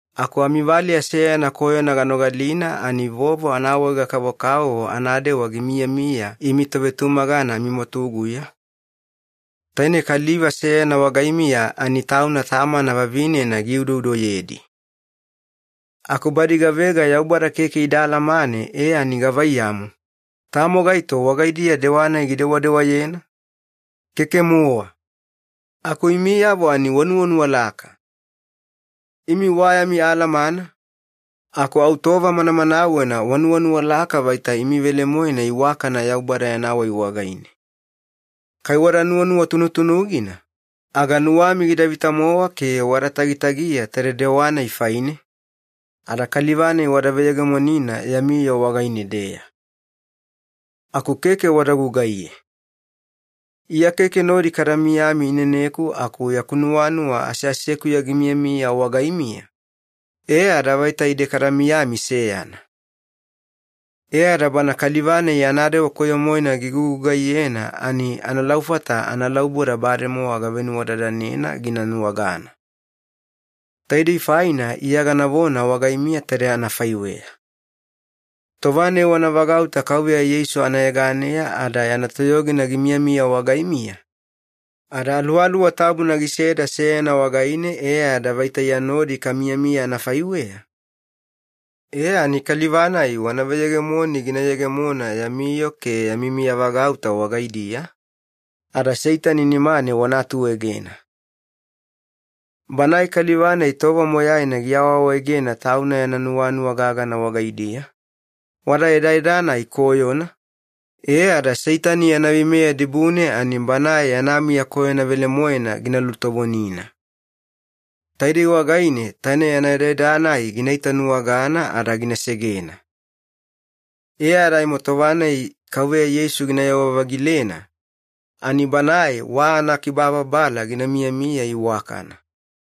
Aku amivaleya seyana koyona ganogalina ani vovo anaawaega-kavokavovo anadewa gimiyamiya imi tovetumagana amimwatuguya, taine kaliva seyana wagaimiya ani tauna tamana vavinena giudoudoyedi. Aku badi gavega Yaubada keke ida alamane e ani gavaiyamu, tamo gaito wagaidiya dewa-nai gidewadewayena? Keke-mowa. Aku imiyavo ani wanuwanuwalaka! Imi wa yami alamana, aku au tova manamanawena wanuwanuwalaka vaita imi velemoena iwakana Yaubada yana wai wagaine. Kai wada nuwanuwa tunutunugina, aga nuwami gida vita-mowa ke wada tagitagiya taide dewa-nai faine, ada kaliva-nai wada veyegemonina yami yoo wagaine-deya. Aku keke wada gugaiye. Iya keke nodi kada miyami ineneku aku yaku nuwanuwa aseasekuya gimiyamiya wagaimiya, e ada vaita ide kada miyami seyana. E ada bana kaliva-nai yana dewa koyo-moena gigugugaiyena ani analaufata analauboda bademowa gavenuwadadanena gina nuwagana. Taidei faina Iya ganavona wagaimiya taide anafaiweya. Tova-nai wana vagauta Kauveya Yeisu anayeganeya ada yana toyogina gimiyamiya wagaimiya, ada Aluwaluwa Tabuna giseda seyana wagaine e ada vaita Iya nodi kamiyamiya anafaiweya, e ani kaliva-nai wana veyegemoni gina yegemona yami yoo ke yami miyavagauta wagaidiya, ada Seitani nimane wana atuegena. Banae kaliva-nai tova moyaina giawaawaegena tauna yana nuwanuwa gagana wagaidiya, wada edaeda-nai koyona, e ada Seitani yana veimeya dibune ani banae yana miya koyona velemoena gina lutovonina. Taidei wagaine taine yana edaeda-nai gina itanuwagana ada gina segena. E ada aimo tova-nai Kauveya Yeisu ginayewa-vagilena, ani banae wa anakibababala gina miyamiya iwakana.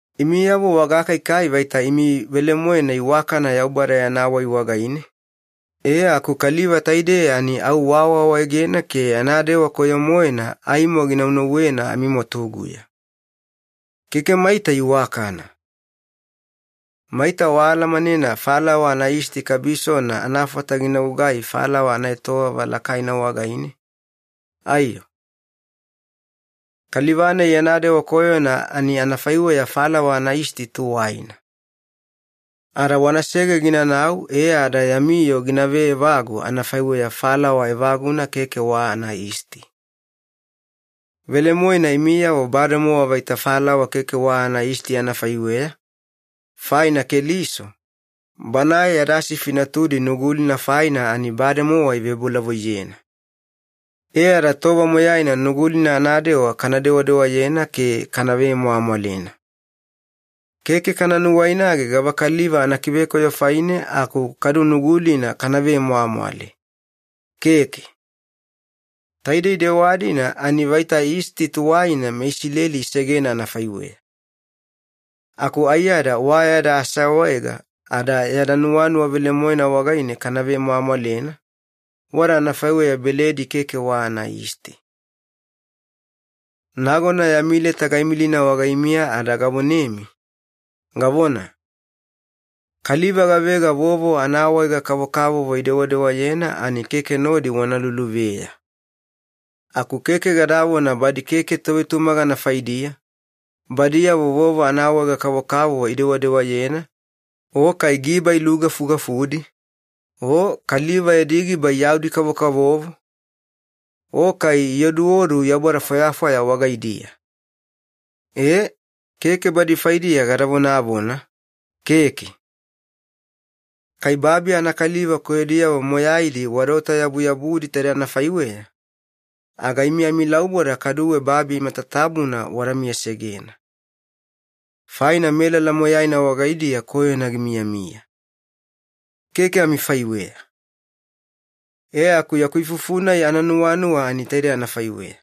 Imiyavo wagakaikai vaita imi velemoena iwakana Yaubada yana wai wagaine, e aku kaliva taidei ani au waawaawaegena ke yana dewa koyo-moena aimo ginaunauwena amimwatuguya. Keke maita iwakana! Maita waalamanena falawa anayisti kabisona anafata gina gugai falawa anaetowava lakaina wagaine, aiyo? Kaliva-nai yana dewa koyona ani anafaiweya falawa anayisti tuwaina. Ada wanasege ginanau e ada yami yoo gina veevagu anafaiweya falawa evaguna keke wa anayisti. Velemoena imiyavo bademowa vaita falawa keke wa anayisti anafaiweya, faina Keliso, Banae yada sifi natudi Nugulina faina ani bademowa ivebolavoiyena. E ada tova moyaina Nugulina anadewa kana dewadewayena ke kana vemwamwalena. Keke kana nuwainage gavakaliva anakivekoyo faine aku kadu Nugulina kana vemwamwale. Keke. Taidei dewa-dina ani vaita yisti tuwaina meIsileli isegena anafaiweya. Aku aiyada wa yada aseawaega ada yada nuwanuwa velemoena wagaine kana vemwamwalena, wada anafaiweya beledi keke wa anayisti. Nagona yami leta gaimilina wagaimiya ada gavonemi, gavona, “Kaliva gavega vovo anaawaega-kavokavovo idewadewayena ani keke nodi wana luluveya.” Aku keke gadavona badi keke tovetumagana faidiya, badiyavo vovo anaawaega-kavokavovo idewadewayena, o kai giba ilugafugafudi, o kaliva yadi giba iyaudi-kavokavovo, o kai ioduodu yaubada fwayafwaya wagaidiya. E, keke badi faidiya gada vonavona, keke. Kai babi anakaliva koyodiyavo moyaidi wadaota-yabuyabudi taide anafaiweya, aga imi amilauboda kaduwe babi matatabuna wada miyasegena. Faina melala moyaina wagaidiya koyona gimiyamiya. Keke amifaiweya. E aku yaku ifufu-nai ananuwanuwa ani taidei anafaiweya.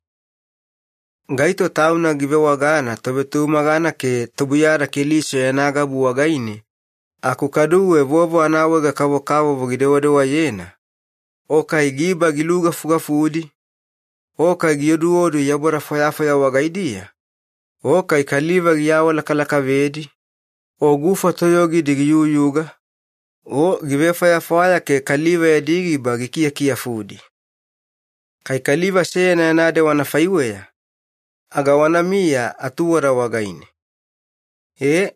Gaito tauna givewagana tovetumagana ke tubuiyada Keliso yana gabu wagaine aku kaduwe vovo anaawaega-kavokavovo gidewadewayena, o kai giba gilugafugafudi, o kai gioduodu yaubada fwayafwaya wagaidiya, o kai kaliva giawalakalakavedi, o gufa toyogidi giyuyuga, o givefwayafwaya ke kaliva yadi giba gikiyakiyafudi. Kai kaliva seyana yana dewa anafaiweya, aga wanamiya atuwada wagaine. E,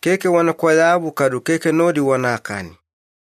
keke wana kwayabu kadu keke nodi wanakani.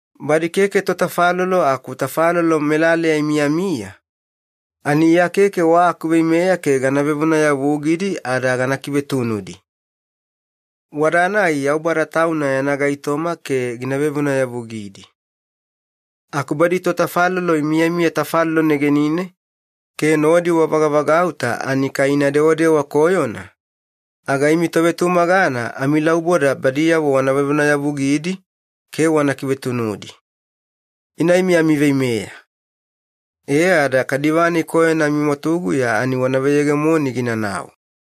Badi keke totafalolo aku tafalolo melaleya imiyamiya, ani Iya keke wa akuveimeya ke gana vevonayavugidi ada gana kivetunudi. Wada-nai Yaubada Tauna yana gaitoma ke gina vevonayavugidi. Aku badi totafalolo imiyamiya tafalolo negenine ke nodi wavagavagauta ani kai ina dewadewa koyona, aga imi tovetumagana amilauboda badiyavo wana vevonayavugidi ke wana kivetunudi. Ina imi amiveimeya. E ada kaliva-nai koyona amimwatuguya ani wana veyegemoni ginanau.